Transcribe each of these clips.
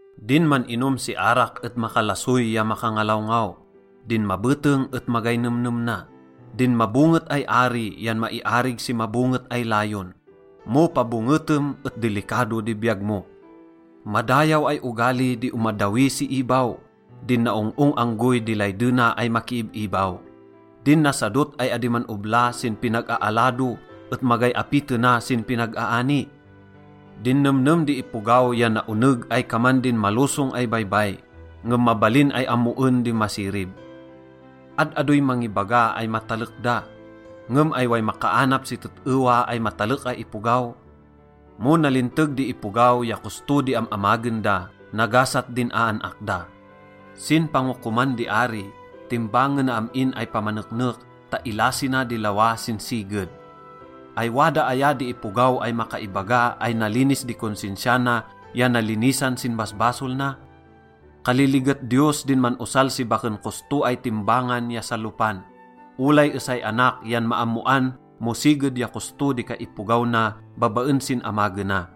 Din man-inom si arak et makalasoy ya makangalawngaw. Din mabeteng et magay nemnem na. Din mabonget ay ari yan maiarig si mabonget ay layon. Mo pabongetem et dilikado di biyag mo. Madayaw ay ogali di omaddawi si ibaw. Din naong-ong anggoy di laydena ay makiib-ibaw. Din nasadot ay adi man-obla sin pinag-aalado et magay apitena sin pinag-aani. Din nemnem di ipogaw yan naoneg ay kaman din malosong ay baybay, ngem mabalin ay ammoen di masirib. Ad-adoy mangibaga ay matalek da, ngem ay way makaanap si tet-ewa ay matalek ay ipogaw? Mo nalinteg di ipogaw ya kosto di am-amagen da, nagasat din aan-ak da. Sin pangokoman di ari, timbangena am-in ay pamaneknek ta ilasina di lawa sin siged. Ay wada aya di ipogaw ay makaibaga ay nalinis di konsensia na ya nalinisan sin basbasol na? Kaliliget Diyos din man-osal si baken kosto ay timbangan ya salopan. Olay esay anak yan maammoan mo siged ya kosto di kaipogaw na babaen sin amagena.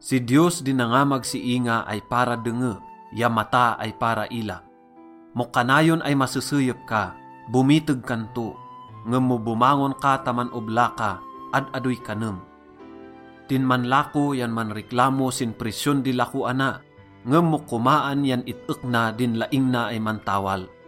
Si Diyos di nangamag si inga ay para denge ya mata ay para ila. Mo kanayon ay maseseyep ka, bomiteg kan to, ngem mo bomangon ka ta man-obla ka, ad-adoy kanem. Din manlako yan manreklamo sin presyon di lakoana, ngem mo komaan yan it-ek na din laing na ay mantawal.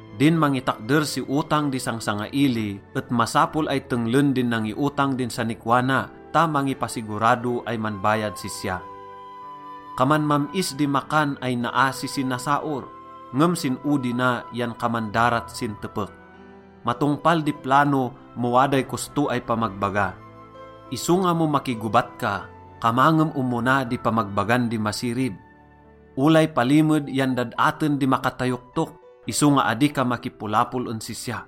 Din mangitakder si otang di sangsangaili et masapol ay tenglen din nangiotang din sanikwa na ta mangipasigurado ay manbayad sisya. Kaman mam-is di makan ay naa si sinasaor, ngem sin odi na yan kaman darat sin tepek. Matongpal di plano mo waday kosto ay pamagbaga, isonga mo makigobat ka, kamangem omona di pamagbagan di masirib. Olay palimed yan dad-aten di makatayoktok, isonga adi ka makipolapol en sisya.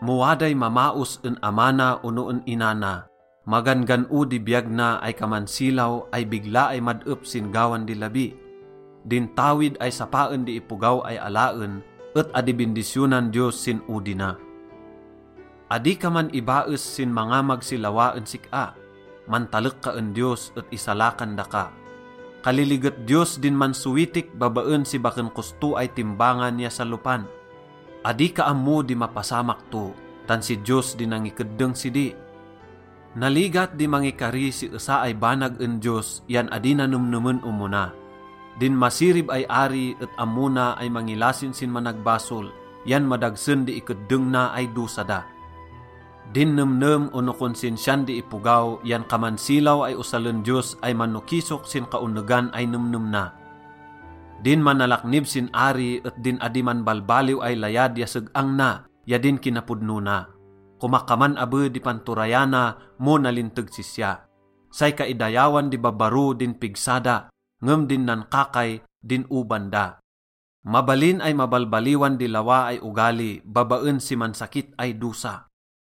Mo waday mamaos en ama na ono en ina na, magan-gan-o di biyag na ay kaman silaw ay bigla ay mad-ep sin gawan di labi. Din tawid ay sapaen di ipogaw ay alaen et adi bindisyonan Diyos sin odi na. Adi ka man-ibaes sin mangamag si lawa en sik-a. Mantalek ka en Diyos et isalakan daka. Kaliliget Diyos din mansowitik babaen si baken kosto ay timbangan ya salopan. Adi ka ammo di mapasamak to, tan si Diyos di nangikeddeng sidi. Naligat di mangikari si esa ay banag en Diyos yan adi na nemnemen omona. Din masirib ay ari et ammo na ay mangilasin sin managbasol yan madagsen di ikeddeng na ay dosa da. Din nemnem ono konsensian di ipogaw yan kaman silaw ay osalen Diyos ay manokisok sin kaonegan ay nemnem na. Din manalaknib sin ari et din adi manbalbaliw ay layad ya seg-ang na ya din kinapodno na. Komakaman abe di panturayana mo nalinteg sisya. Say kaidayawan di babbaro din pigsa da, ngem din nankakay, din oban da. Mabalin ay mabalbaliwan di lawa ay ogali babaen si mansakit ay dosa.